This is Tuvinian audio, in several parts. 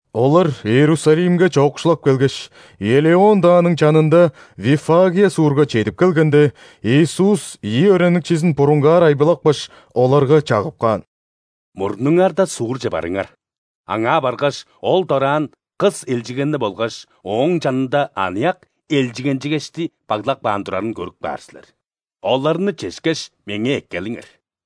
Олар Иерусалимге чоокшулап келгеш, Елеон дааның чанында Виффагия суурга чедип келгенде, Иисус ийи өөреникчизин бурунгаар айбылапкаш, оларга чагып каан: «Мурнуңарда суурже барыңар. Аңаа баргаш, ол дораан кыс элчигенни болгаш ооң чанында аныяк элчигенчигешти баглап каан турарын көрүп каар силер. Оларны чешкеш, Меңээ эккелиңер.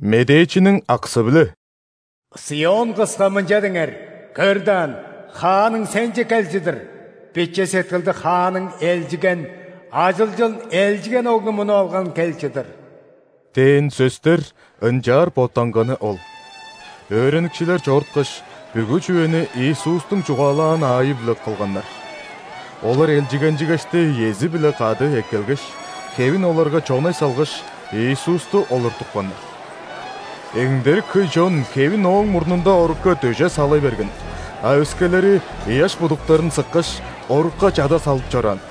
Медээчиниң аксы-биле:«·Сион-кыска мынча деңер:„Көр даан, Хааның сенче кел чыдыр.Биче сеткилдиг Хааның элчиген, ажылчын элчиген оглумунуп алган кел чыдыр“» – дээн сөстер ынчаар боттанганы ол. Өөреникчилер чоруткаш, бүгү чүвени Иисустуң чугаалаан аайы-биле кылганнар. Олар элчигенчигешти иези-биле кады эккелгеш, хевин оларга чонай салгаш, Иисусту олуртупканнар. Эңдерик хөй чон хевин Ооң мурнунда орукка дөжей сала берген, а өскелери ыяш будуктарын сыккаш, орукка чада салып чораан.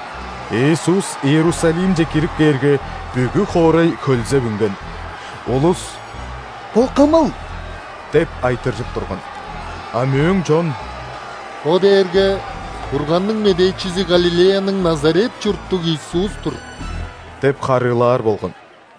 Иисус Иерусалимче кирип кээрге, бүгү хоорай хөлзеп үнген. Улус: «Бо Кымыл?» – деп айтыржып турган. А мөөң чон: «Бо дээрге Бурганның медээчизи Галилеяның Назарет чурттуг Иисус-тур» – деп харыылаар болган.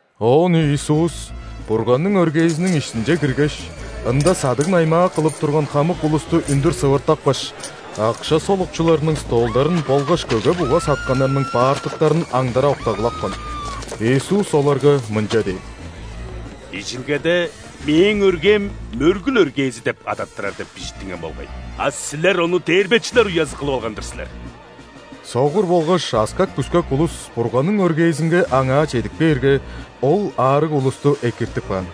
Оон Иисус Бурганның өргээзиниң иштинче киргеш, ында садыг-наймаа кылып турган хамык улусту үндүр сывыртапкаш, акша солукчуларының столдарын болгаш көге-буга сатканнарның баартактарын аңдара октагылапкан. Иисус оларга мынча дээн: «Бижилгеде: „Мээң өргээм мөргүл өргээзи деп адаттырар“ деп бижиттинген болгай, а силер ону дээрбечилер уязы кылып алган-дыр силер!» Согур болгаш аскак-бүскек улус Бурганның өргээзинге Аңаа чедип кээрге, Ол аарыг улусту экиртип каан.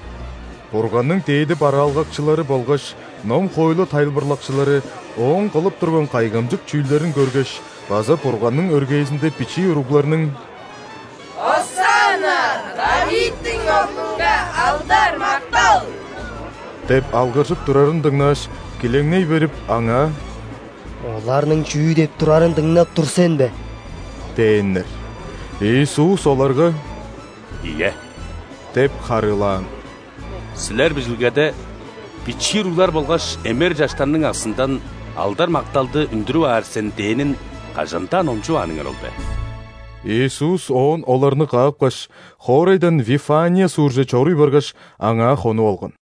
Бурганның дээди бараалгакчылары болгаш ном-хоойлу тайылбырлакчылары Ооң кылып турган кайгамчык чүүлдерин көргеш база Бурганның өргээзинде бичии уругларның: «Осанна!R ·Давидтиң Оглунга алдар-мактал!» – деп алгыржып турарын дыңнааш, килеңней берип, Аңаа: «Оларның чүү деп турарын дыңнап тур сен бе?!» – дээннер. Иисус оларга: «Ийе – деп харыылаан. – Силер Бижилгеде: „Бичии уруглар болгаш эмер чаштарның аксындан алдар-макталды үндүрүп аар сен“ дээнин кажан-даа номчувааныңар ол бе?» Иисус оон оларны каапкаш, хоорайдан Вифания суурже чоруй баргаш, аңаа хонуп алган.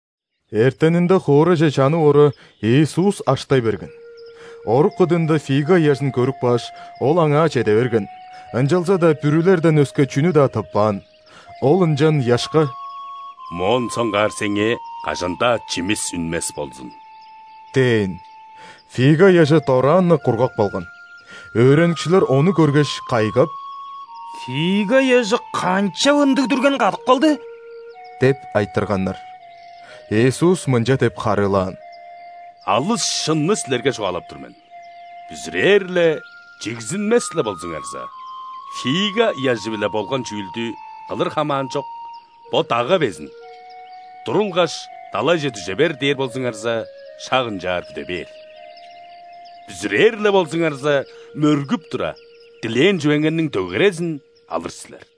Эртенинде, хоорайже чанып ора, Иисус аштай берген. Орук кыдыында фига ыяжын көрүп кааш, Ол аңаа чеде берген, ынчалза-даа бүрүлерден өске чүнү-даа тыппаан. Ол ынчан ыяшка: «Моон соңгаар сеңээ кажан-даа чимис үнмес болзун!» – дээн. Фига ыяжы дораан-на кургап калган. Өөреникчилер ону көргеш, кайгап: «Фига ыяжы канчап ындыг дүрген кадып калды?» – деп айтырганнар. Иисус мынча деп харыылаан: «Алыс шынны силерге чугаалап тур мен: бүзүрээр-ле, чигзинмес-ле болзуңарза, фига ыяжы-биле болган чүүлдү кылыр хамаанчок, бо дагга безин: „Турулгаш, далайже дүже бер!“ – дээр болзуңарза, шак ынчаар бүде бээр. Бүзүрээр-ле болзуңарза, мөргүп тура, дилээн чүвеңерниң дөгерезин алыр силер».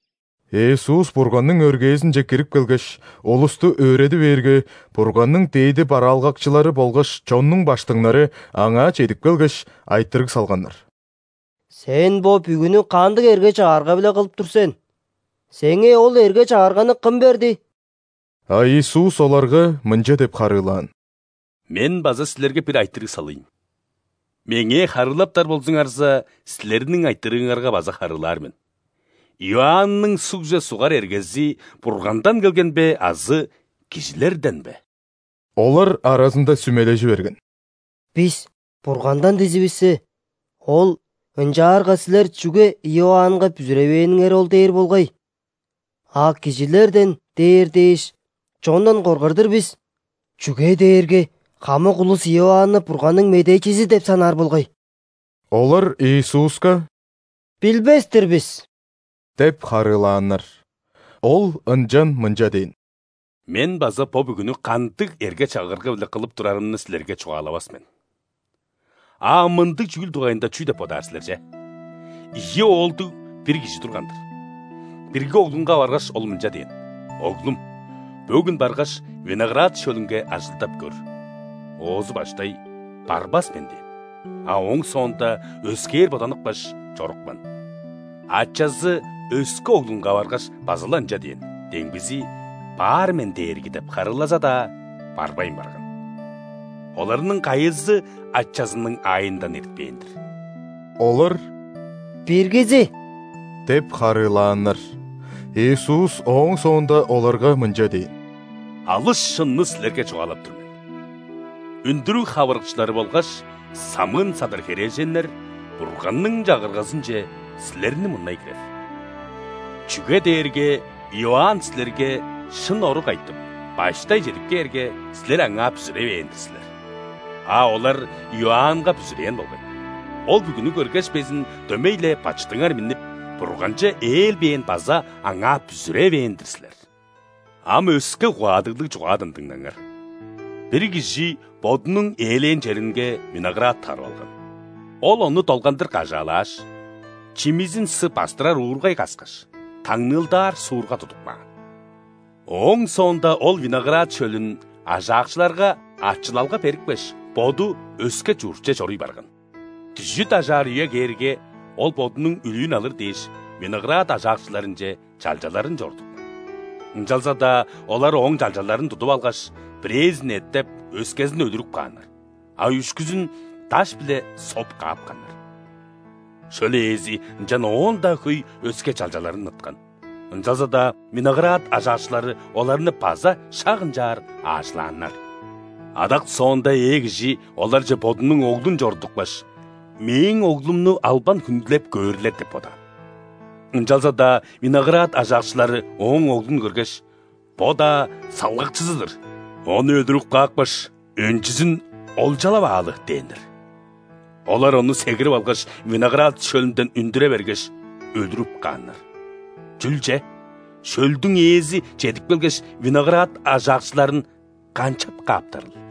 Иисус Бурганның өргээзинче кирип келгеш, улусту өөреди бээрге, Бурганның дээди бараалгакчылары болгаш чоннуң ·баштыңнары Аңаа чедип келгеш, айтырыг салганнар: «Сен бо бүгүнү кандыг эрге-чагырга-биле кылып тур сен? Сеңээ ол эрге-чагырганы кым берди?» А Иисус оларга мынча деп харыылаан: «Мен база силерге бир айтырыг салыйн. Меңээ харыылаптар болзуңарза, силерниң айтырыыңарга база харыылаар мен. Иоанның ·сугже сугар эргези Бургандан келген бе азы кижилерден бе?» Олар аразында сүмележи берген: «Бис: „Бургандан“ – дизивиссе, Ол: „Ынчаарга силер чүге Иоаннга бүзүревээниңер ол?“ – дээр болгай. А: „Кижилерден“ – дээр дээш, чондан коргар-дыр бис, чүге дээрге хамык улус Иоанны Бурганның медээчизи деп санаар болгай». Олар Иисуска: «Билбес-тир бис» – деп харыылааннар. Ол ынчан мынча дээн: «Мен база бо бүгүнү кандыг эрге-чагырга-биле кылып турарымны силерге чугаалавас мен». «А ам мындыг чүүл дугайында чүү деп бодаар силер че? Ийи оолдуг бир кижи турган-дыр. Бирги оглунга баргаш, ол мынча дээн: „Оглум, бөгүн баргаш, виноград шөлүнге ажылдап көр“. Оозу баштай: „Барбас мен“ – дээн, а ооң соонда өскээр боданыпкаш, чорупкан. Ачазы өске оглунга баргаш, база-ла ынча дээн. Демгизи: „Баар мен, дээрги“ – деп харыылаза-даа, барбайн барган. Оларның кайызы ачазының аайындан эртпээн-дир?» Олар: «Биргизи» – деп харыылааннар. Иисус ооң соонда оларга мынча дээн: «Алыс шынны силерге чугаалап тур мен: үндүрүг хавырыкчылары болгаш самыын-садар херээженнер Бурганның Чагыргазынче силерни мурнай кирер. Чүге дээрге Иоанн силерге шын орук айтып, баштай чедип кээрге, силер аңаа бүзүревээн-дир силер. А олар Иоаннга бүзүрээн болгай. Ол бүгүнү көргеш безин, дөмей-ле бачыдыңар миннип, Бурганче ээлбээн база аңаа бүзүревээн-дир силер». «Ам өске угаадыглыг чугаадан дыңнаңар. Бир кижи бодунуң ээлээн черинге виноград тарып алган. Ол ону долгандыр кажаалааш, чимизин сы бастырар уургай каскаш, таңныылдаар суурга тудуп каан. Ооң соонда ол виноград шөлүн ажаакчыларга ачылалга берипкеш, боду өске чуртче чоруй барган. Дүжүт ажаар үе кээрге, ол бодунуң үлүүн алыр дээш, виноград ажаакчыларынче чалчаларын чорудупкан. Ынчалза-даа олар ооң чалчаларын тудуп алгаш, бирээзин эттеп, өскезин өлүрүп кааннар, а үшкүзүн даш-биле соп каапканнар. Шөл ээзи ынчан оон-даа хөй өске чалчаларын ыткан, ынчалза-даа виноград ажаакчылары оларны база шак ынчаар аажылааннар. Адак соонда ээ кижи оларже бодунуң оглун чорудупкаш: „Мээң оглумну албан хүндүлеп көөрлер“ – деп бодаан. Ынчалза-даа виноград ажаакчылары ооң оглун көргеш: „Бо-даа салгакчызы-дыр! Ону өлүрүп каапкаш, өнчүзүн олчалап аалы“ – дээннер. Олар ону сегирип алгаш, виноград шөлүнден үндүре бергеш, өлүрүп кааннар. Чүл че, шөлдүң ээзи чедип келгеш, виноград ажаакчыларын канчап кааптарыл?»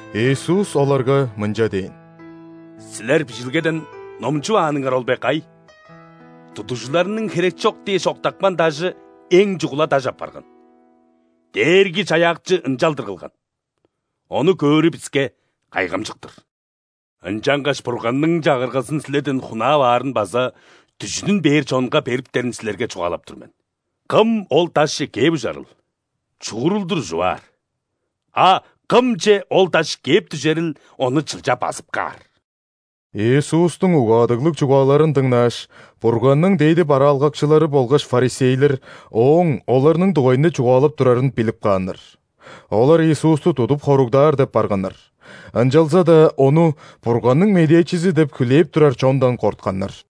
Иисус оларга мынча дээн: «Силер Бижилгеден номчувааныңар ол бе кай:„Тудугжуларның херекчок дээш октапкан дажыэң чугула даш апарган.Дээрги-Чаяакчы ынчалдыр кылган,ону көөрү биске кайгамчык-тыр!“ Ынчангаш Бурганның Чагыргазын силерден хунаап аарын база „дүжүдүн“ бээр чонга бериптерин силерге чугаалап тур мен. Кым ол дашче кээп ужарыл, чуурулдур ужуп аар, а кымче ол даш кээп дүжерил ону чылча базып каар». Иисустуң угаадыглыг чугааларын дыңнааш, Бурганның дээди бараалгакчылары болгаш ·фарисейлер Ооң оларның дугайында чугаалап турарын билип кааннар. Олар Иисусту тудуп хоругдаар деп барганнар, ынчалза-даа Ону Бурганның медээчизи деп хүлээп турар чондан кортканнар.